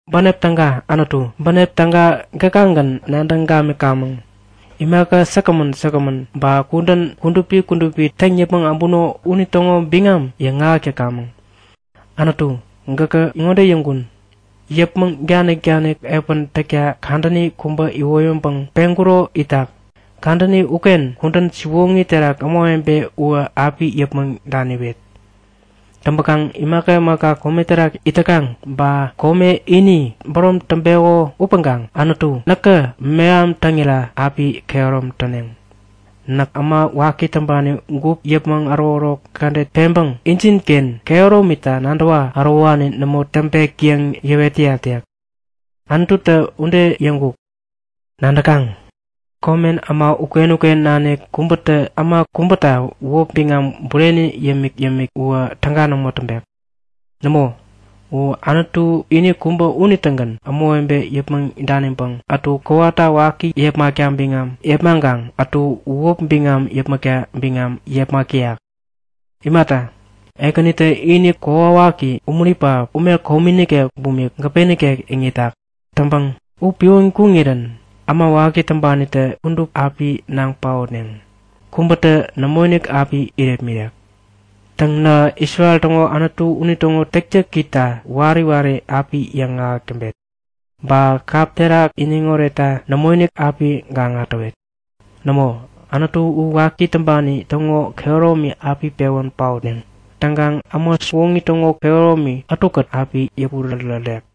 Bänep täga, Anutu, bänep täga gäkagän nadäŋ gamikamäŋ! Imaka säkgämän säkgämän, ba kudän kudupi kudupi täŋ yäpmäŋ äbuno unitäŋo biŋam yaŋahäk täkamäŋ. Anutu, gäkä ŋode yäŋkun; Yäpmäŋ danik-danik epän täkta kadäni kubä iwoyäŋpäŋ peŋkuro itak. Kadäni uken kudän siwoŋi terak ämawebe uwä api yäpmäŋ daniwet. Täŋpäkaŋ imaka imaka kome terak it täkaŋ ba kome ini bärom täŋpeko upäŋkaŋ Anutu näkä meham täŋira api kehärom täneŋ. Näk äma waki täŋpani gup yäpmäŋ ärokärok kädet peŋpäŋ injinken kehäromita nadäwä ärowani nämo täŋpek yäŋ yäwet täyat yäk. Anututä ude yäŋkuk. Nadäkaŋ, komen äma uken-uken nanik kubätä äma kubäta wäp biŋam bureni yämik-yämik uwä täga nämo täŋpek. Nämo, u Anutu ini kubä unitägän ämawebe yäpmäŋ daniŋpäŋ ätu kowata waki yäpmäkta biŋam yepmaŋkaŋ ätu wäpi biŋam yäpmäkta biŋam yepmak täyak. Imata, Ekänitä ini kokwawaki umuri pähap, ume komi nikek bumik gäpe nikek iŋitak. Täŋpäŋ u piwän kuŋirän äma waki täŋpanitä kudup api naŋ paotneŋ. Kubätä nämoinik api irepmirek. Täŋ nähä Isrel täŋo Anutu unitäŋo täktäkita wari wari api yäŋahäk täŋpet. Ba kap terak iniŋ oretta nämoinik api gaŋa täwet. Nämo, Anutu u waki täŋpani täŋo kehäromi api pewän paotneŋ. Täŋkaŋ äma siwoŋi täŋo kehäromi ätukät api yäpurärärek.